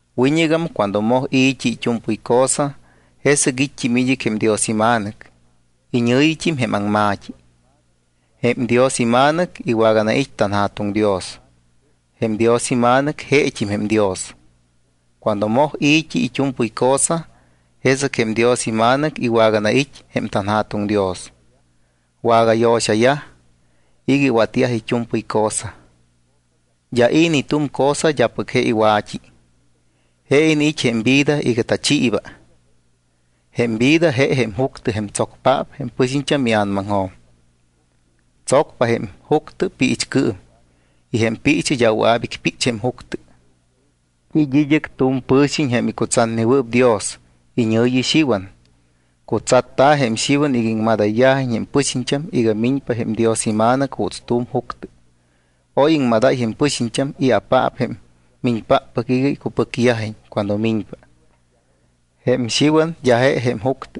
Wiñɨgam cuando moj i̱t́i it́u̱mpɨy cosa, jesɨc it́t́im id́ɨc jém Dios iMa̱nɨc, iñɨ̱yit́im jém Aŋma̱t́i. Jém Dios iMa̱nɨc iwaganait́ tanJa̱tuŋ Dios. Jém Dios iMa̱nɨc jeet́im jém Dios. Cuando moj i̱t́i it́u̱mpɨy cosa, jesɨc jém Dios iMa̱nɨc iwaganait́ jém tanJa̱tuŋ Dios. Wagayo̱xayaj iga iwatyajpa it́u̱mpɨy cosa. D́a i̱ ni tu̱m cosa d́apɨc je iwa̱t́i. Je iniit́ jém vida iga tachiiba. Jém vida je jém juctɨ jém tsocpáppɨc jém pɨxiñt́am ia̱namaŋjo̱m. Tsocpa jém juctɨ piichcɨɨm y jém piichɨ d́a wɨa̱p icpích jém juctɨ. It́ id́ɨc tu̱m pɨ̱xiñ jém icutsatnewɨɨp Dios, iñɨ̱yi Xiwan. Cutsatta̱ jém Xiwan iga iŋmadáyiñ jém pɨxiñt́am iga miñpa jém Dios iMa̱nɨc juuts tu̱m juctɨ. Oy iŋmadáy jém pɨxiñt́am i̱apaap jém miñpáppɨc iga icupɨcyajiñ cuando miñpa. Jém Xiwan d́a je jém juctɨ,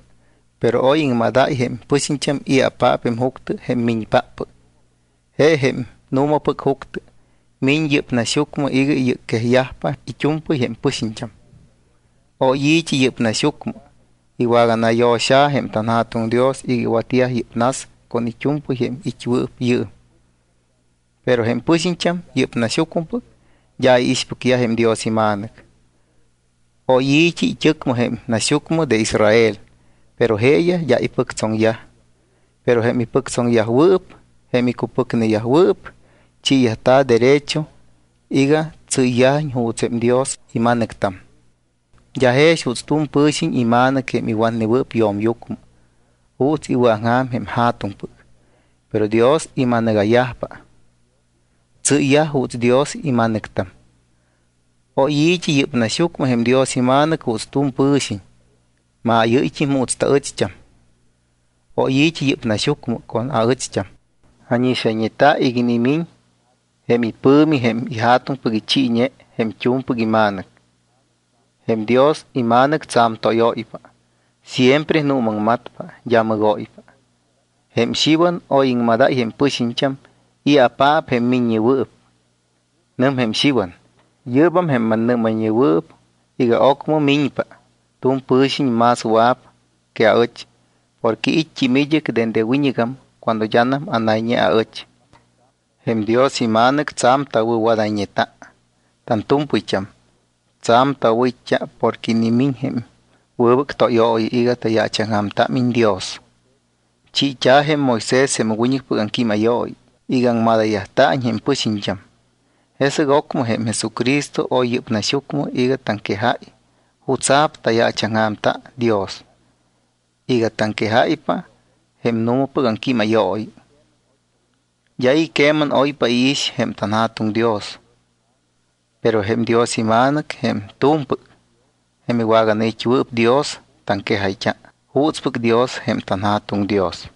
pero oy iŋmadáy jém pɨxiñt́am i̱apaap jém juctɨ jém miñpáppɨc. Je jém nu̱mapɨc juctɨ. Miñ yɨ́p naxyucmɨ iga iyɨcquejyajpa it́u̱mpɨy jém pɨxiñt́am. Oy i̱t́i yɨ́p naxyucmɨ. Iwaganayo̱xa̱ jém tanJa̱tuŋ Dios iga iwatyaj yɨ́p nas con it́u̱mpɨy jém it́wɨɨp yɨɨm, pero jém pɨxiñt́am, yɨ́p naxyucmɨpɨc, d́a iixpɨcyaj jém Dios iMa̱nɨc. Oy i̱t́i it́ɨcmɨ, jém naxyucmɨ de Israel, pero jeeyaj d́a ipɨctsoŋyaj. Pero jém ipɨctsoŋneyajwɨɨp, jém icupɨcneyajwɨɨp, chiiyajta̱ derecho iga tsɨ́yyajiñ juuts jém Dios ima̱nɨctam. D́a jex juuts tu̱m pɨ̱xiñ ima̱nɨc jém iwatnewɨɨp yo̱myucmɨ, juuts iwɨ̱aŋja̱m jém ja̱tuŋpɨc, pero Dios ima̱nɨga̱yajpa. Tsɨ́yyaj juuts Dios ima̱nɨctam. Oy i̱t́i yɨ́p naxyucmɨ jém Dios iMa̱nɨc juuts tu̱m pɨ̱xiñ. Maayɨ́yt́im juuts taɨcht́am. Oy i̱t́i yɨ́p naxyucmɨ con aɨcht́am. Ánixayñeta iga inimiñ jém ipɨ̱mi jém iJa̱tuŋpɨc ichiiñe jém t́u̱mpɨc iMa̱nɨc. Jém Dios iMa̱nɨc tsa̱m tóyóypa, siempre nuumaŋmatpa, d́a mɨgóypa. Jém Xiwan oy iŋmadáy jém pɨxiñt́am i̱apaap jém miññewɨɨp. Nɨm jém Xiwan: —Yɨ́bam jém mannɨ́mayñewɨɨp iga ocmɨm miñpa tu̱m pɨ̱xiñ más wɨa̱p que aɨch porque it́t́im id́ɨc dende wiñɨgam cuando d́anam anayñe aɨch. Jém Dios iMa̱nɨc tsa̱m tawɨ̱wadayñeta tantu̱mpɨyt́am. Tsa̱m tawɨ̱it́t́a porque inimiñ jém wɨbɨc tóyooyi iga tayaachaŋja̱mtámiñ Dios. Chiit́a̱ jém Moisés jém wiñɨcpɨc aŋquímayooyi iga aŋmadayyajta̱iñ jém pɨxiñt́am. Jesɨc ocmɨ jém Jesucristo oy yɨ́p naxyucmɨ iga taŋquejáy jutsa̱p tayaachaŋja̱mta Dios y iga taŋquejáypa jém nu̱mapɨc aŋquímayooyi. D́a i̱ queman oypa iix jém tanJa̱tuŋ Dios; pero jém Dios iMa̱nɨc, jém t́u̱mpɨc, jém iwaganait́wɨɨp Dios, taŋquejayt́a juutspɨc Dios jém tanJa̱tuŋ Dios.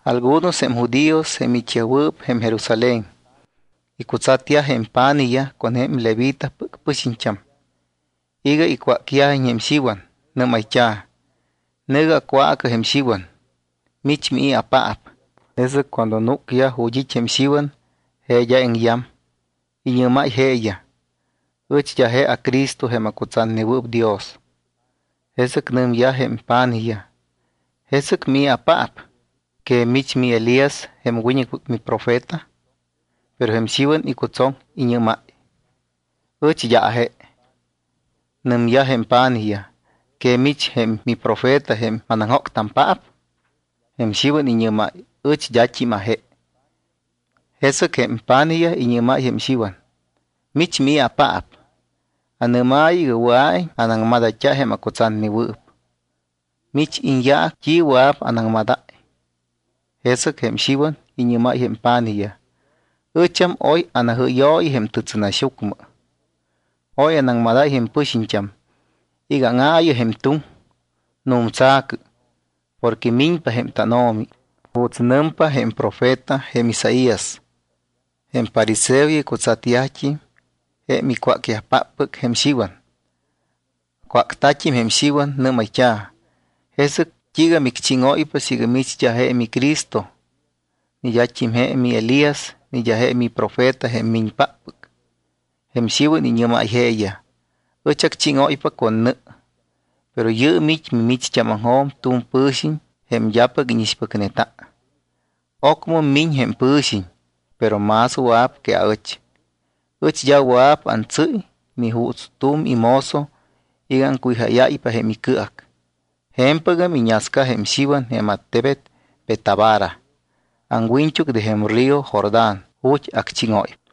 Algunos jém judíos, jém it́yajwɨɨp jém Jerusalén, icutsatyaj jém pa̱nijyaj con jém levitapɨc pɨxiñt́am iga icwácyajiñ jém Xiwan. Nɨ́mayt́a̱: —Nɨ̱gɨ acwaacɨ jém Xiwan: “¿Mich, mii̱apaap?” Jesɨc cuando núcyaj ju̱t́ it́ jém Xiwan, je d́a iŋyam. Iñɨ́máy jeeyaj: —Ɨch d́a je aCristo jém acutsatnewɨɨp Dios. Jesɨc nɨmyaj jém pa̱nijyaj: —¿Jesɨc mii̱apaap? ¿Que mich jém miElías jém wiñɨcpɨc miprofeta? Pero jém Xiwan icutsoŋ. Iñɨ́máy: —Ɨch d́a aje. Nɨmyaj jém pa̱nijyaj: —¿Que mich jém miprofeta jém manaŋjóctampaap? Jém Xiwan iñɨ́máy: —Ɨch d́at́im aje. Jesɨc jém pa̱nijyaj iñɨ́mayyaj jém Xiwan: —¿Mich, mii̱apaap? Anɨ́maayɨ iga wɨa̱iñ anaŋmadayt́a jém acutsatnewɨɨp. ¿Mich iñyaac, t́i wɨa̱p anaŋmadáy? Jesɨc jém Xiwan iñɨ́máy jém pa̱nijyaj: —Ɨcham oy anajɨ́yooyi jém tɨtsɨnaxyucmɨ. Oy anaŋmadáy jém pɨxiñt́am iga: “Áŋaayɨ jém tuŋ, nu̱mtsa̱cɨ, porque miñpa jém tánO̱mi”, juuts nɨmpa jém profeta jém Isaías. Jém fariseoyaj icutsatyajt́im jém icwácyajpáppɨc jém Xiwan. Acwácta̱t́im jém Xiwan, nɨ́mayt́a̱: —¿Jesɨc t́iiga micchíŋóypa siiga mich d́a je miCristo, ni d́a je miElías ni d́a je miprofeta jém miñpáppɨc? Jém Xiwan iñɨ́máy jeeyaj: —Ɨch acchíŋóypa con nɨ. Pero yɨɨm it́ mimicht́ámaŋjo̱m tu̱m pɨ̱xiñ jém d́apɨc íñixpɨcneta. Ocmɨm miñ jém pɨ̱xiñ, pero más wɨa̱p que aɨch. Ɨch d́a wɨa̱p antsɨ́y ni juuts tu̱m imozo iga aŋcuwijáyáypa jém icɨac. Je̱mpɨgam iñasca jém Xiwan jém attebet Betábara, aŋwiñt́uc de jém río Jordán ju̱t́ acchíŋóypa.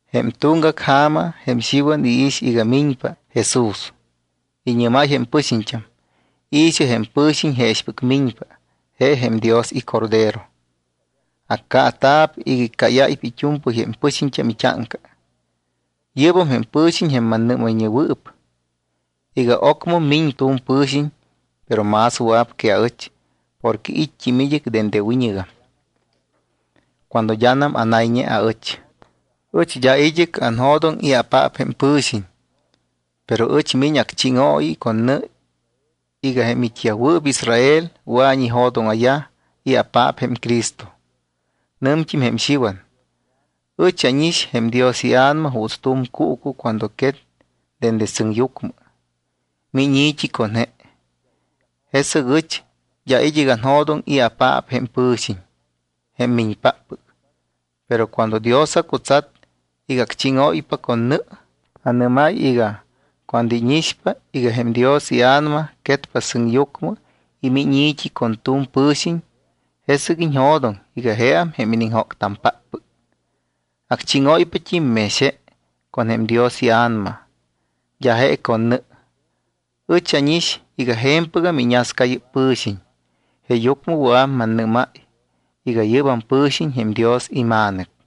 Jém tuŋgac ja̱ma jém Xiwan iix iga miñpa Jesús, iñɨ́máy jém pɨxiñt́am: —I̱xɨ, jém pɨ̱xiñ jeexɨc miñpa, je jém Dios iCordero. Accaata̱p iga iccáyáypa it́u̱mpɨy jém pɨxiñt́am it́áŋca. Yɨ́bam jém pɨ̱xiñ jém mannɨ́mayñewɨɨp iga: “Ocmɨm miñpa tu̱m pɨ̱xiñ, pero más wɨa̱p que aɨch, porque it́t́im dende wiñɨgam cuando d́anam anayñe aɨch.” Ɨch d́a id́ɨc anjo̱doŋ i̱apaap jém pɨ̱xiñ, pero ɨch miñ acchíŋooyi con nɨ iga jém it́yajwɨɨp Israel wɨa̱iñ ijo̱dóŋa̱yaj i̱apaap jém Cristo. Nɨmt́im jém Xiwan: —Ɨch ánix jém Dios iA̱nama juuts tu̱m cuucu cuando quet dende sɨŋyucmɨ. Miñ i̱t́i con je. Jesɨc ɨch d́a id́ɨc anjo̱doŋ i̱apaap jém pɨ̱xiñ jém miñpáppɨc, pero cuando Dios acutsat iga acchíŋóypa con nɨ, anɨ́máy iga: “Cuando íñixpa iga jém Dios iA̱nama quetpa sɨŋyucmɨ y miñ i̱t́i con tu̱m pɨ̱xiñ, jesɨc iñjo̱doŋ iga jeam jém iniŋjócpáppɨc. Acchíŋóypat́im mex je con jém Dios iA̱nama, d́a je con nɨ.” Ɨch ánix iga je̱mpɨgam iñasca yɨ́p pɨ̱xiñ, jeeyucmɨ wɨa̱p mannɨ́máy iga yɨ́bam pɨ̱xiñ jém Dios iMa̱nɨc.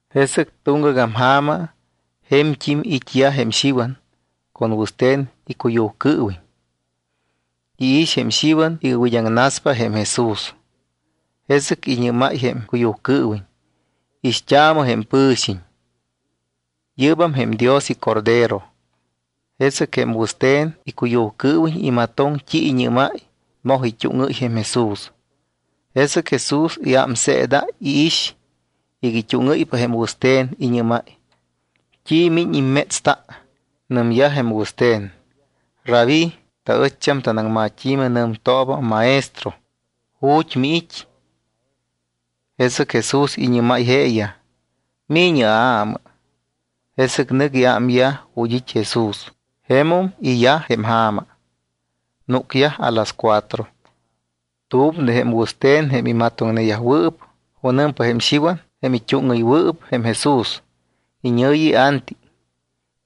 Jesɨc tuŋgagam ja̱ma je̱mt́im it́yaj jém Xiwan con wɨste̱n jém icuyujcɨɨwiñ. Iix jém Xiwan iga wid́aŋnaspa jém Jesús. Jesɨc iñɨ́máy jém icuyujcɨɨwiñ: —Ixt́aamɨ jém pɨ̱xiñ. Yɨ́bam jém Dios iCordero. Jesɨc jém wɨste̱n icuyujcɨɨwiñ imatoŋ t́i iñɨ́máy, moj it́úŋɨ́y jém Jesús. Jesɨc Jesús iámseedáy, iix iga it́úŋɨ́ypa jém wɨste̱n, iñɨ́máy: —¿T́i miñ immétsta? Nɨmyaj jém wɨste̱n: —¿Rabí, (taɨcht́am tanaŋmat́i̱mɨ nɨmtooba, Maestro), ju̱t́ miit́? Jesɨc Jesús iñɨ́máy jeeyaj: —Mi̱ñɨ aamɨ. Jesɨc nɨc iámyaj ju̱t́ it́ Jesús. Jemum iyaj jém ja̱ma, núcyaj a las cuatro. Tu̱m de jém wɨste̱n jém imatoŋneyajwɨɨp junɨmpa jém Xiwan, jém it́úŋɨywɨɨp jém Jesús, iñɨ̱yi Anti.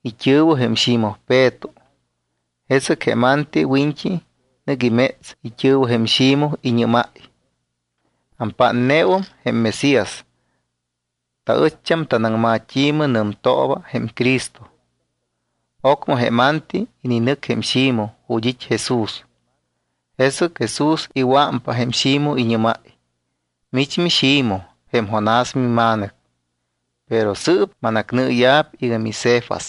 It́ɨ̱wɨ jém Ximoj Peto. Jesɨc jém Anti wiñt́i nɨc iméts it́ɨ̱wɨ jém Ximoj, iñɨ́máy: —Ampátneum jém Mesías. (Taɨcht́am tanaŋmat́i̱mɨ nɨmtooba jém Cristo.) Ocmɨ jém Anti ininɨc jém Ximoj ju̱t́ it́ Jesús. Jesɨc Jesús iwɨ̱ámpa jém Ximoj, iñɨ́máy: —Mich miXimoj, jém Jonás mima̱nɨc, pero sɨɨp manacnɨɨya̱p iga miCefas.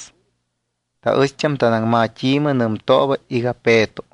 (Taɨcht́am tanaŋmat́i̱mɨ nɨmtooba iga Peto.)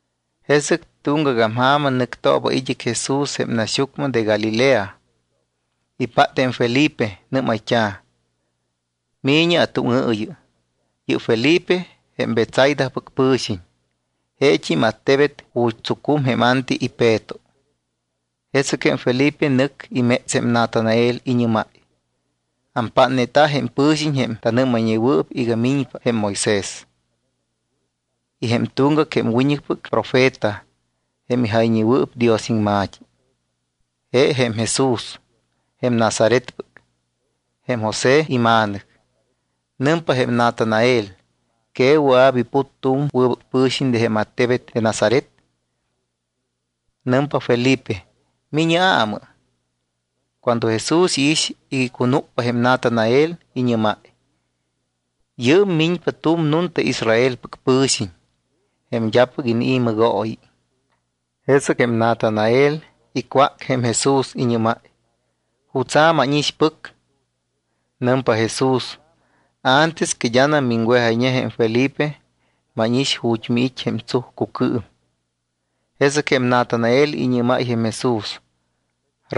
Jesɨc tuŋgagam ja̱ma nɨctooba id́ɨc Jesús jém naxyucmɨ de Galilea. Ipát jém Felipe. Nɨ́mayt́a̱: —Mi̱ñɨ atúŋɨɨyɨ. Yɨ́p Felipe jém Betsaidapɨc pɨ̱xiñ, jeet́im attebet ju̱t́ tsucum jém Anti y Peto. Jesɨc jém Felipe nɨc iméts jém Natanael, iñɨ́máy: —Ampátneta jém pɨ̱xiñ jém tanɨ́mayñewɨɨp iga miñpa jém Moisés y jém tuŋgac jém wiñɨcpɨc profeta jém ijayñewɨɨp Dios iŋma̱t́i. Je jém Jesús, jém Nazaretpɨc, jém José ima̱nɨc. Nɨmpa jém Natanael: —¿Que wɨa̱p iput tu̱m wɨbɨc pɨ̱xiñ de jém attebet de Nazaret? Nɨmpa Felipe: —Mi̱ñɨ aamɨ. Cuando Jesús iix iga icunúcpa jém Natanael, iñɨ́máy: —Yɨɨm miñpa tu̱m nunta Israelpɨc pɨ̱xiñ, jém d́apɨc inii̱ mɨgooyi. Jesɨc jém Natanael icwác jém Jesús, iñɨ́máy: —¿Jutsa̱ mánixpɨc? Nɨmpa Jesús: —Antes que d́anam miŋwejayñe jém Felipe, mánix ju̱t́ miit́ jém tsujcucɨɨm. Jesɨc jém Natanael iñɨ́máy jém Jesús: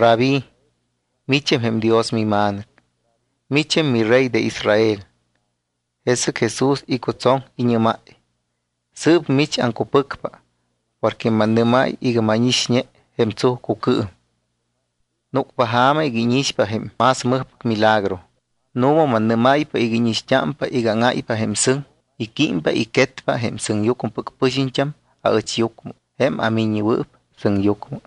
—Rabí, micham jém Dios miMa̱nɨc. Micham miRey de Israel. Jesɨc Jesús icutsoŋ, iñɨ́máy: —Sɨɨp mich aŋcupɨcpa porque mannɨ́máy iga mánixñe jém tsujcucɨɨm. Núcpa ja̱ma iga íñixpa jém más mɨjpɨc milagro. Nu̱ma mannɨ́máypa iga íñixt́ámpa iga áŋáypa jém sɨŋ y químpa y quetpa jém sɨŋyucmɨpɨc pɨxiñt́am aɨchyucmɨ, jém aMiññewɨɨp Sɨŋyucmɨ.